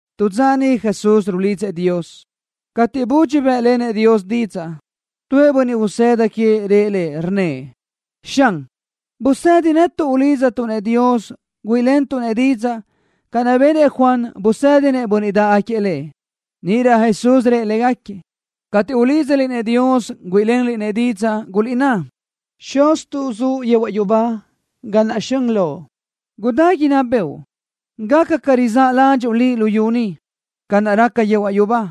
Tu dza niʼ Jesús rulidzëʼ Dios. Cateʼ budxi bë́ʼlenëʼ Dios didzaʼ, tuëʼ bönniʼ usëda queëʼ rëʼ Lëʼ, rnnëʼ: —Xan, busedi netuʼ ulídzatuʼ-nëʼ Dios güíʼilentuʼ-nëʼ didzaʼ, ca benëʼ Juan, busédinëʼ bönniʼ dáʼgaquiëʼ lëʼ. Níʼirö Jesús rëʼ légaquiëʼ: —Cateʼ ulídzaliʼ-nëʼ Dios güíʼilenliʼ-nëʼ didzaʼ, guliʼná: Xuztuʼ, zuʼ yehuaʼ yubá, gáʼana zxön Loʼ. Gudá inná bëʼu. Gaca ca raza ládxuʼu Liʼ luyú ni, ca naʼ raca yehuaʼ yubá.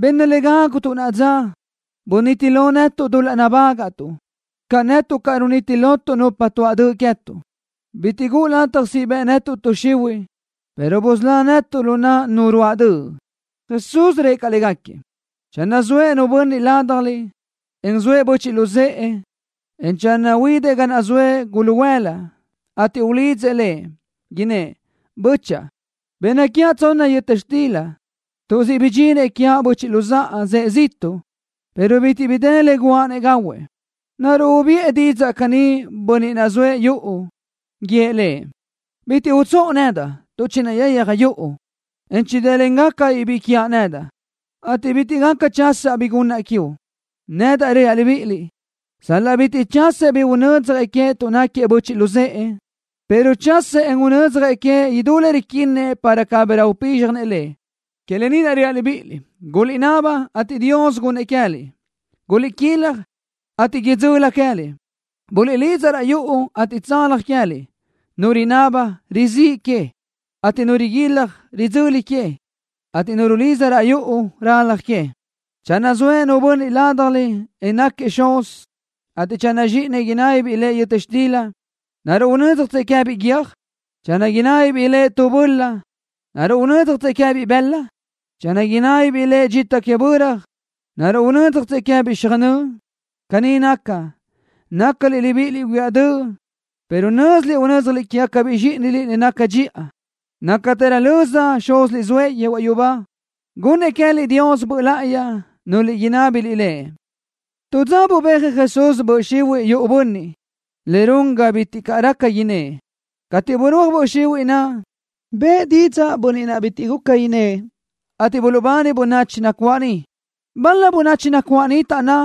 Benna le gágutuʼ naʼa dza. Buniti lo netuʼ dul-laʼ nabágaʼtuʼ ca netuʼ caʼ runiti lotuʼ nupa tuaʼ döʼ queë́tuʼ. Bitiʼ guʼu lataj siʼ bëʼ tuʼ xihuiʼ netuʼ, pero busölá netuʼ lu naʼ nu ruáʼ döʼ. Jesús rëʼ caʼ légaquiëʼ: —Channö zoëʼ nu bönniʼ ládjaliʼ, en zoëʼ böchiʼ luzë́ʼë, en channö huidëʼ ga naʼ zoëʼ guluhuëla, ateʼ ulidzëʼ lëʼ, innë́ʼ: “Bö́chaʼa, benna quiaʼ tsonna yöta xtila tuʼ siʼ bidxinëʼ quiaʼ böchiʼ luzáʼa, zëʼë ziʼtuʼ, pero bitiʼ bi dë le guʼa-nëʼ gahuëʼ.” ¿Naruʼ ubiʼë didzaʼ caní bönniʼ naʼ zoëʼ yuʼu, guíëʼ lëʼ: “Bitiʼ utsóʼo nedaʼ tuʼ chinayayaj yuʼu, en chidë́lengacabiʼ biʼi quiaʼ nedaʼ, ateʼ bitiʼ gaca chasaʼ bi gunnaʼ quiuʼ”? Nedaʼ reaʼ libíʼiliʼ: Sal-laʼ bitiʼ chasëʼ bi unödzjëʼ queëʼ tuʼ náquiëʼ böchiʼ luzë́ʼë, pero chasëʼ, en unödzjëʼ queëʼ idutë le riquinnëʼ para cabirö upízxjanëʼ lëʼ. Que lë ni naʼ reaʼ libíʼiliʼ: Guliʼnaba, ateʼ Dios gunnëʼ queë́liʼ. Guliʼquilaj, ateʼ idzöli queë́liʼ. Buliʼlidza raʼ yuʼu, ateʼ tsalaj queë́liʼ. Nu rinaba, rizíʼ que, ateʼ nu riguilaj, ridzöli que, ateʼ nu rulidza raʼ yuʼu, ralaj que. ’Channö zoëʼ nu bönniʼ ládjaliʼ, en náquiëʼ xuz, ateʼ channö zxíʼinëʼ inábibiʼ lëʼ yöta xtila, ¿naruʼ unö́dzjatsëʼ queë́biʼ guiö́j? Channö inábibiʼ lëʼ tubaʼ böla, ¿naruʼ unö́dzjatsëʼ queë́biʼ bëla? Channö inábibiʼ lëʼ dxita que böra, ¿naruʼ unö́dzjatsëʼ queë́biʼ xöjnö́ʼ? Caní naca, nácaliʼ libíʼiliʼ huiáʼ döʼ, pero nö́ziliʼ unö́dzjaliʼ quégacabiʼ zxíʼiniliʼ le naca dxiʼa. Nácatërö löza Xúziliʼ zoëʼ yehuaʼ yubá gunnëʼ queë́liʼ Dios Böʼ Láʼayi, núlöliʼ inábiliʼ Lëʼ. Tu dza bubéajëʼ Jesús böʼ xihuiʼ yuʼu tu bönniʼ, le run ga bitiʼ raca innë́ʼ. Cateʼ burúaj böʼ xihuiʼ naʼ, bëʼë didzaʼ bönniʼ naʼ bitiʼ guca innë́ʼ, ateʼ buluʼbani bönachi nacuáʼ niʼ. Bal-la bönachi nacuáʼ niʼ taʼnná: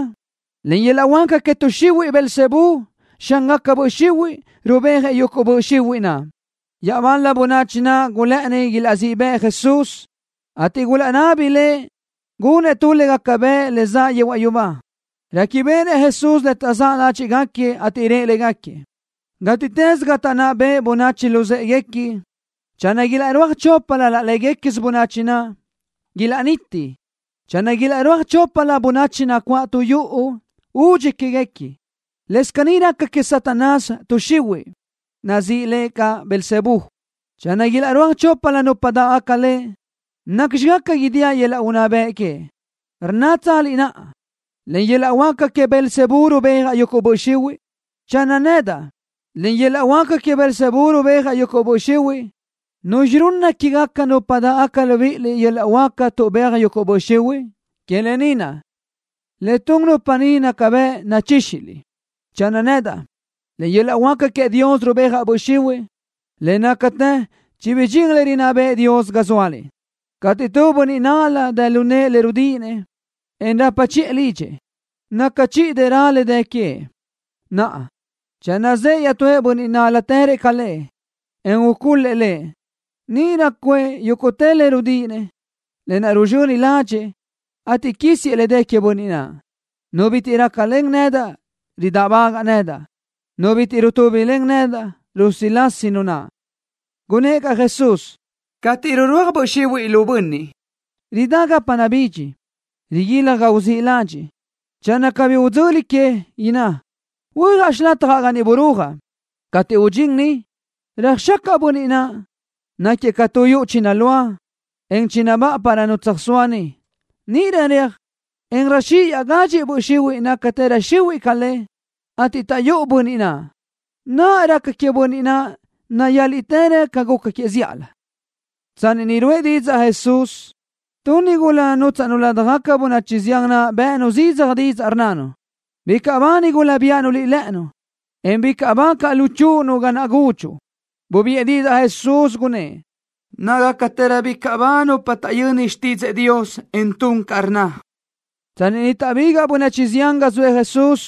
—Len yöl-laʼ huáca que tuʼ xihuiʼ Beelzebú, xángaca böʼ xihuiʼ, rubéajëʼ yuguʼ böʼ xihuiʼ naʼ. Iaʼbal-la bönachi naʼ gulë́ʼëni ilaʼzíʼ bëʼ Jesús, ateʼ gulaʼnabi Lëʼ gunëʼ tu le gaca bëʼ le zaʼ yehuaʼ yubá. Réquibeʼenëʼ Jesús le taʼzáʼ ládxiʼgaquiëʼ, ateʼ rëʼ légaquiëʼ: —Gátiʼtës ga taʼnná beʼe bönachi luzë́ʼeguequi, channö ilaʼrúaj choplö laʼ léguequisö bönachi naʼ, ilaʼniti. Channö ilaʼrúaj choplö bönachi nacuáʼ tu yuʼu, údxi quéguequi. Lëscaʼ caní raca que Satanás, tuʼ xihuiʼ, nazíʼi le caʼ Beelzebú. Channö ilaʼrúaj choplö nupa dáʼgaca le, ¿nacxi gaca idíaʼ yöl-laʼ unná bëʼ que? ¿Rnnátsaliʼ naʼa: Len yöl-laʼ huáca que Beelzebú rubéajaʼ yuguʼ böʼ xihuiʼ? Channö nedaʼ, len yöl-laʼ huáca que Beelzebú rubéajaʼ yuguʼ böʼ xihuiʼ, ¿nuzxi runna quégaca nupa dáʼgaca libíʼiliʼ yöl-laʼ huáca tuʼbéaj yuguʼ böʼ xihuiʼ? Que lë ni naʼ, le tun nupa ni naca bëʼ nachíxiliʼ. Channö nedaʼ, len yöl-laʼ huáca queëʼ Dios rubéajgacaʼ böʼ xihuiʼ, le nácatë chibidxín le rinná bëʼë Dios ga zóaliʼ. ’Cateʼ tu bönniʼ nál-la dë lu nëʼë le rudíʼinëʼ, en rapa chiʼë lidxëʼ, naca chiʼi dërö le dë queëʼ. Naʼa, channö zëʼë iaʼtúëʼ bönniʼ nál-latërëʼ ca lëʼ, en ucul-lëʼ lëʼ, níʼirö cuëʼ yúguʼtë le rudíʼinëʼ, lë naʼ ruzxöni ládxëʼë, ateʼ quísiëʼ le dë queëʼ bönniʼ naʼ. ’Nu bitiʼ rácalen nedaʼ, ridáʼbagaʼ nedaʼ. Nu bitiʼ rutúbilen nedaʼ, rusilasi nu naʼ. Gunnë́ʼ caʼ Jesús: —Cateʼ rirúaj böʼ xihuiʼ lu bönniʼ, ridá gapa nabídx, riguilaj ga uzíʼ ladxiʼ. Channö cabí idzöli que, inná: “Huöjaʼ xilatjaʼ ga niʼ birúajaʼ.” Cateʼ rudxín niʼ, röjxacaʼ bönniʼ naʼ, náquiëʼ ca tu yuʼu chinulúa, en chinabáʼa para nu tsöjsóa niʼ. Níʼirö reaj, en röjxíʼ iaʼgadxi böʼ xihuiʼ, nácagacatërö xihuiʼ ca le, ateʼ taʼyúʼu bönniʼ naʼ. Naʼa, le raca queëʼ bönniʼ naʼ nayáliʼtërö ca le guca queëʼ zíʼalö. Tsanni niʼ ruʼë Jesús didzaʼ ni, tu nigula nútsaʼnu ladaj bönachi zián naʼ bë́ʼënu zidzaj didzaʼ, rnnanu: —Bicaʼ ba nigula naʼ biáʼanu Liʼ lë́ʼënu, en bicaʼ ba caʼ luchúʼunu ga naʼ gúdxuʼu. Bubiʼë didzaʼ Jesús, gunnë́ʼ: —Nácagacatërö bicaʼ ba nupa taʼyöni xtídzëʼë Dios, en tun ca rnna. Tsanni niʼ taʼbigaʼ bönachi zián ga zoëʼ Jesús,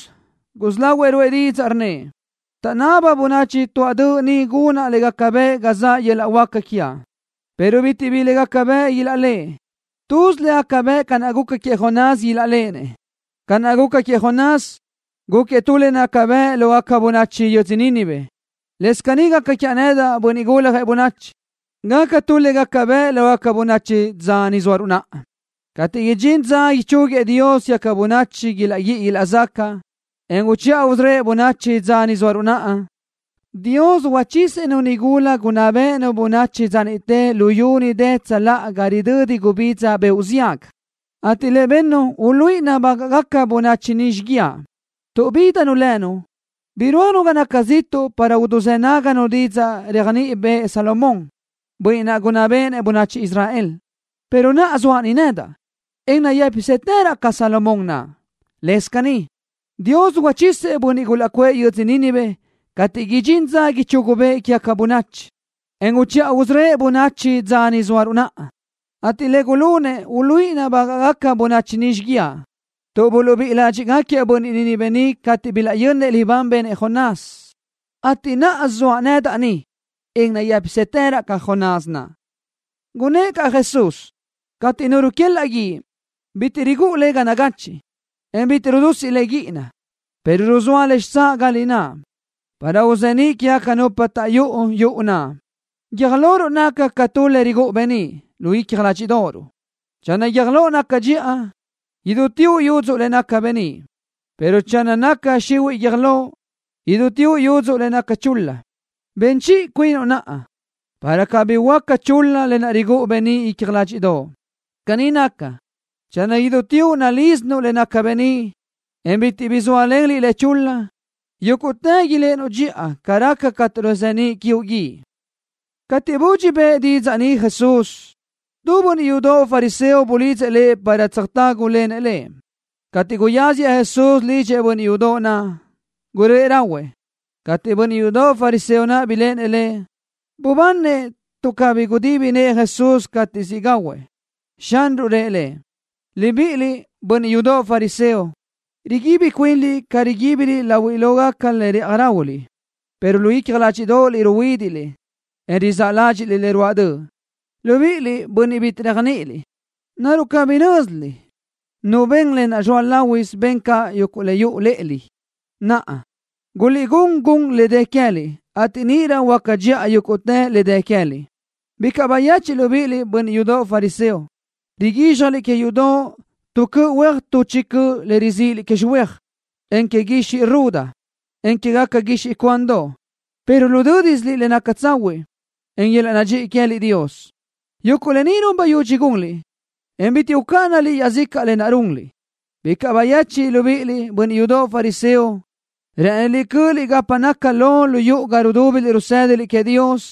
gusí lahuëʼ ruʼë didzaʼ, rnnëʼ: —Taʼnába bönachi tuáʼ döʼ ni gunaʼ le gaca bëʼ ga zaʼ yöl-laʼ huáca quiaʼ, pero bitiʼ bi le gaca bëʼ ilaʼléʼenëʼ. Tuz le gaca bëʼ ca naʼ guca queëʼ Jonás ilaʼléʼenëʼ. Ca naʼ guca queëʼ Jonás, gúquiëʼ tu le naca bëʼ lógaca bönachi yödzö Nínive, lëscaʼ caní gaca quiaʼ nedaʼ, Bönniʼ Guljëʼ Bönachi, gacaʼ tu le gaca bëʼ lógaca bönachi dza ni zóaruʼ naʼa. Cateʼ idxín dza ichúguiëʼ Dios quégaca bönachi ilaʼguíʼi ilaʼzacaʼ, en uchiʼa usörö́ëʼ bönachi dza ni zóaruʼ naʼa, Dios uchisëʼ-nu nigula gunná béʼenu bönachi dza niʼte luyú niʼ dë tsöláʼa ga ridödi gubidza beoʼ ziaga, ateʼ le bennu uluíʼi nabágaʼgaca bönachi ni xíguiaʼ, tuʼ bídanu lënu, birúajnu ga naca ziʼtuʼ para uduzë́ náganu didzaʼ réajniʼi bëʼë Salomón, bönniʼ gunná béʼenëʼ bönachi Israel, pero naʼa, zoaʼ nedaʼ ni, en nayë́pisëtëraʼ ca Salomón naʼ. Lëscaʼ caní, Dios uchisëʼ bönniʼ gulaʼcuʼë yödzö Nínive cateʼ idxín dza ichugu bëʼë quégaca bönachi, en uchiʼa usörö́ëʼ bönachi dza ni zóaruʼ naʼa, ateʼ le gulunëʼ uluíʼi nabágaʼgaca bönachi ni xíguiaʼ, tuʼ buluʼbíʼi ládxiʼgaquiëʼ bönniʼ Nínive cateʼ bilaʼyönnëʼ libán benëʼ Jonás, ateʼ naʼa zoaʼ nedaʼ ni, en nayë́pisëtëraʼ ca Jonás naʼ. Gunnë́ʼ caʼ Jesús: —Cateʼ nu ruquelaʼ guíʼ, bitiʼ rigúʼu le ga nagachiʼ, en bitiʼ rudusiʼ le guíʼina, pero ruzóa le xitsáʼ ga lináʼ, para uzeníʼ quégaca nupa taʼyúʼu yuʼu naʼ. Guiö́j loruʼ naca ca tu le rigúʼu beníʼ lu icja ládxiʼdoʼoruʼ. Channö guiö́j loʼ naca dxiʼa, idúteoʼ yudzu le naca beníʼ, pero channö naca xihuiʼ guiö́j loʼ, idúteoʼ yudzu le naca chul-la. Ben chiʼi cuinuʼ naʼa, para cabí huöáca chul-la lë naʼ rigúʼu beníʼ lu icja ládxiʼdoʼo. Caní naca, channö idúteoʼ nalísinuʼ le naca beníʼ, en bitiʼ bi zóalen liʼ le chul-la, yúguʼtë iléʼenuʼ dxiʼa ca raca cateʼ ruzeníʼ quiuʼ guíʼ. Cateʼ budxi bëʼë didzaʼ ni Jesús, tu bönniʼ yudoʼ fariseo bulidzëʼ Lëʼ para tsöjtágulenëʼ lëʼ. Cateʼ guyáziëʼ Jesús lidxëʼ bönniʼ yudoʼ naʼ, guröʼë rahuëʼ. Cateʼ bönniʼ yudoʼ fariseo naʼ biléʼenëʼ Lëʼ, bubáninëʼ tuʼ cabí gudibi nëʼë Jesús cateʼ siʼ gahuëʼ. Xanruʼ rëʼ lëʼ: —Libiʼiliʼ, bönniʼ yudoʼ fariseo, riguibi cuinliʼ ca riguíbiliʼ láhuilögaca le rë́ʼaji ráhuiliʼ, pero lu icja ládxiʼdoʼoliʼ ruhuídiʼliʼ, en rizáʼ ládxiʼliʼ le ruáʼ döʼ. Libíʼiliʼ, bönniʼ bitiʼ réajniʼiliʼ. ¿Naruʼ cabí nö́ziliʼ, Nu ben le zoa láhuisö ben caʼ le yuʼu lë́ʼelö? Naʼa, guliʼgún gun le dë queë́liʼ, ateʼ níʼirö huöáca dxiʼa yúguʼtë le dë queë́liʼ. ’Bicaʼ bayechiʼ libíʼiliʼ, bönniʼ yudoʼ fariseo. Riguízxjaliʼ que yudoʼ tu cöʼ huéaj tuʼ chi cöʼ le rizíʼiliʼ que xöhuéaj, en que guixiʼ ruda, en quégaca guixiʼ cuandoʼ, pero rudö́disiliʼ le naca tsahuiʼ, en yöl-laʼ nadxíʼi queë́liʼ Dios. Yuguʼ lë ni run bayudxi gunliʼ, en bitiʼ ucáʼanaliʼ iaʼzicaʼ lë naʼ runliʼ. ’Bicaʼ bayechiʼ libíʼiliʼ, bönniʼ yudoʼ fariseo. Rë́ʼëniliʼ cö́ʼöliʼ gapa naca lo lu yuʼu ga rudúbiliʼ rusë́daliʼ queëʼ Dios,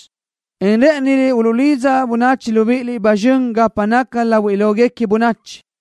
en rë́ʼëniliʼ uluʼlidza bönachi libíʼiliʼ ba zxön gapa naca láhuilöguequi bönachi.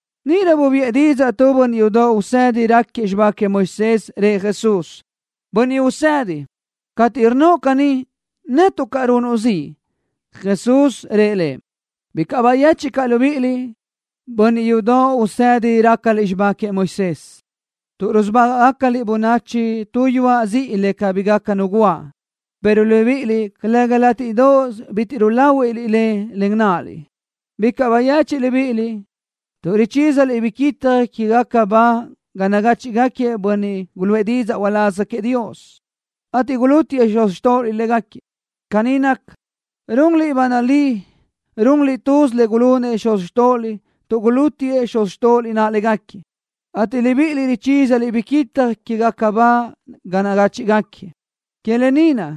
Níʼirö bubiʼë didzaʼ tu bönniʼ yudoʼ usedi raquiëʼ xibá queëʼ Moisés. Rëʼ Jesús: —Bönniʼ Usedi, cateʼ rnnoʼ caní, netuʼ caʼ runuʼ ziʼ. Jesús rëʼ lëʼ: —Bicaʼ bayechiʼ caʼ libíʼiliʼ, bönniʼ yudoʼ usedi rácaliʼ xibá queëʼ Moisés, tuʼ rusubágaʼgacaliʼ bönachi tu yuaʼ ziʼi le cabí gaca nu guáʼ, pero libíʼiliʼ calëga látiʼdoʼos bitiʼ ruláhuiʼliʼ le len náʼaliʼ. ’Bicaʼ bayechiʼ libíʼiliʼ, tuʼ richísaliʼ biquitaj quégaca ba ga nagáchiʼgaquiëʼ bönniʼ guluʼë didzaʼ uláz queëʼ Dios, ateʼ gulútiëʼ xuz xtóʼoliʼ légaquiëʼ. Caní naca, runliʼ ba nalí runliʼ tuz le gulunëʼ xuz xtóʼoliʼ tuʼ gulútiëʼ xuz xtóʼoliʼ naʼ légaquiëʼ, ateʼ libíʼiliʼ richísaliʼ biquitaj quégaca ba ga nagáchiʼgaquiëʼ. ’Que lë ni naʼ,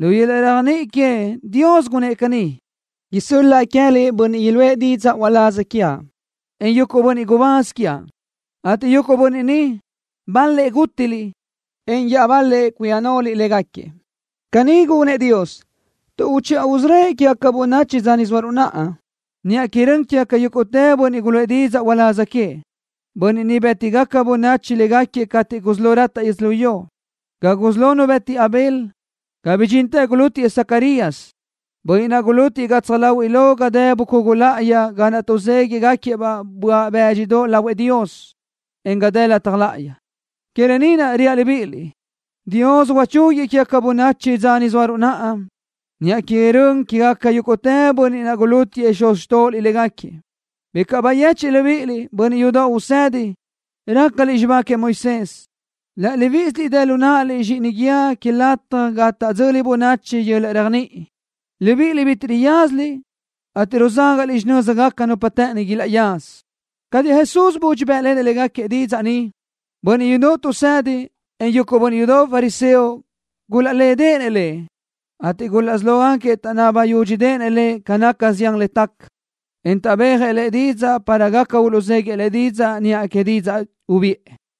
lu yöl-laʼ réajniʼi queëʼ, Dios gunnë́ʼ caní: “Isö́l-laʼa queë́liʼ bönniʼ iluʼë didzaʼ uláz quiaʼ, en yuguʼ bönniʼ gubáz quiaʼ, ateʼ yuguʼ bönniʼ ni, bal-lëʼ gútiliʼ, en iaʼbal-lëʼ cuia naʼliʼ légaquiëʼ.” Caní gunëʼ Dios tuʼ uchiʼa usörö́ëʼ quégaca bönachi dza ni zóaruʼ naʼa, niʼa que rön quégaca yúguʼtë bönniʼ guluʼë didzaʼ uláz queëʼ, bönniʼ niʼ bë́tigaca bönachi légaquiëʼ cateʼ gusí lo rataʼ yödzölió, ga gusí lo nu bëti Abel, ga bidxintë gulútiëʼ Zacarías, bönniʼ naʼ gulútiëʼ gatsaj láhuiʼlö ga dë bucugu láʼayi ga naʼ tuʼzéguiʼgaquiëʼ-baʼ böaʼ bë́dxidoʼ lahuëʼ Dios, en ga dë lataj láʼayi. Que lë ni naʼ, reaʼ libíʼiliʼ, Dios uchúguëʼ quégaca bönachi dza ni zóaruʼ naʼa, niʼa que rön quégaca yúguʼtë bönniʼ naʼ gulútiëʼ xuz xtóʼoliʼ légaquiëʼ. ’Bicaʼ bayechiʼ libíʼiliʼ, bönniʼ yudoʼ usedi, rácaliʼ xibá queëʼ Moisés. Laʼ libíʼisiliʼ dë lu náʼaliʼ zxíʼini guíë que lataj ga taʼdzöli bönachi yöl-laʼ réajniʼi. Libíʼiliʼ bitiʼ riyázaliʼ, ateʼ ruzágaʼliʼ xinö́zigaca nupa të́ʼëni ilaʼyaza. Cateʼ Jesús budxi bë́ʼlenëʼ légaquiëʼ didzaʼ ni, bönniʼ yudoʼ tuʼsédinëʼ, en yuguʼ bönniʼ yudoʼ fariseo gulaʼlédeʼenëʼ Lëʼ, ateʼ gulaʼsí lógaquiëʼ taʼnaba yúdxideʼenëʼ Lëʼ ca naca zián le taca, en tuʼbéajëʼ Lëʼ didzaʼ para gaca uluʼzéguiëʼ Lëʼ didzaʼ niʼa que didzaʼ ubiʼë.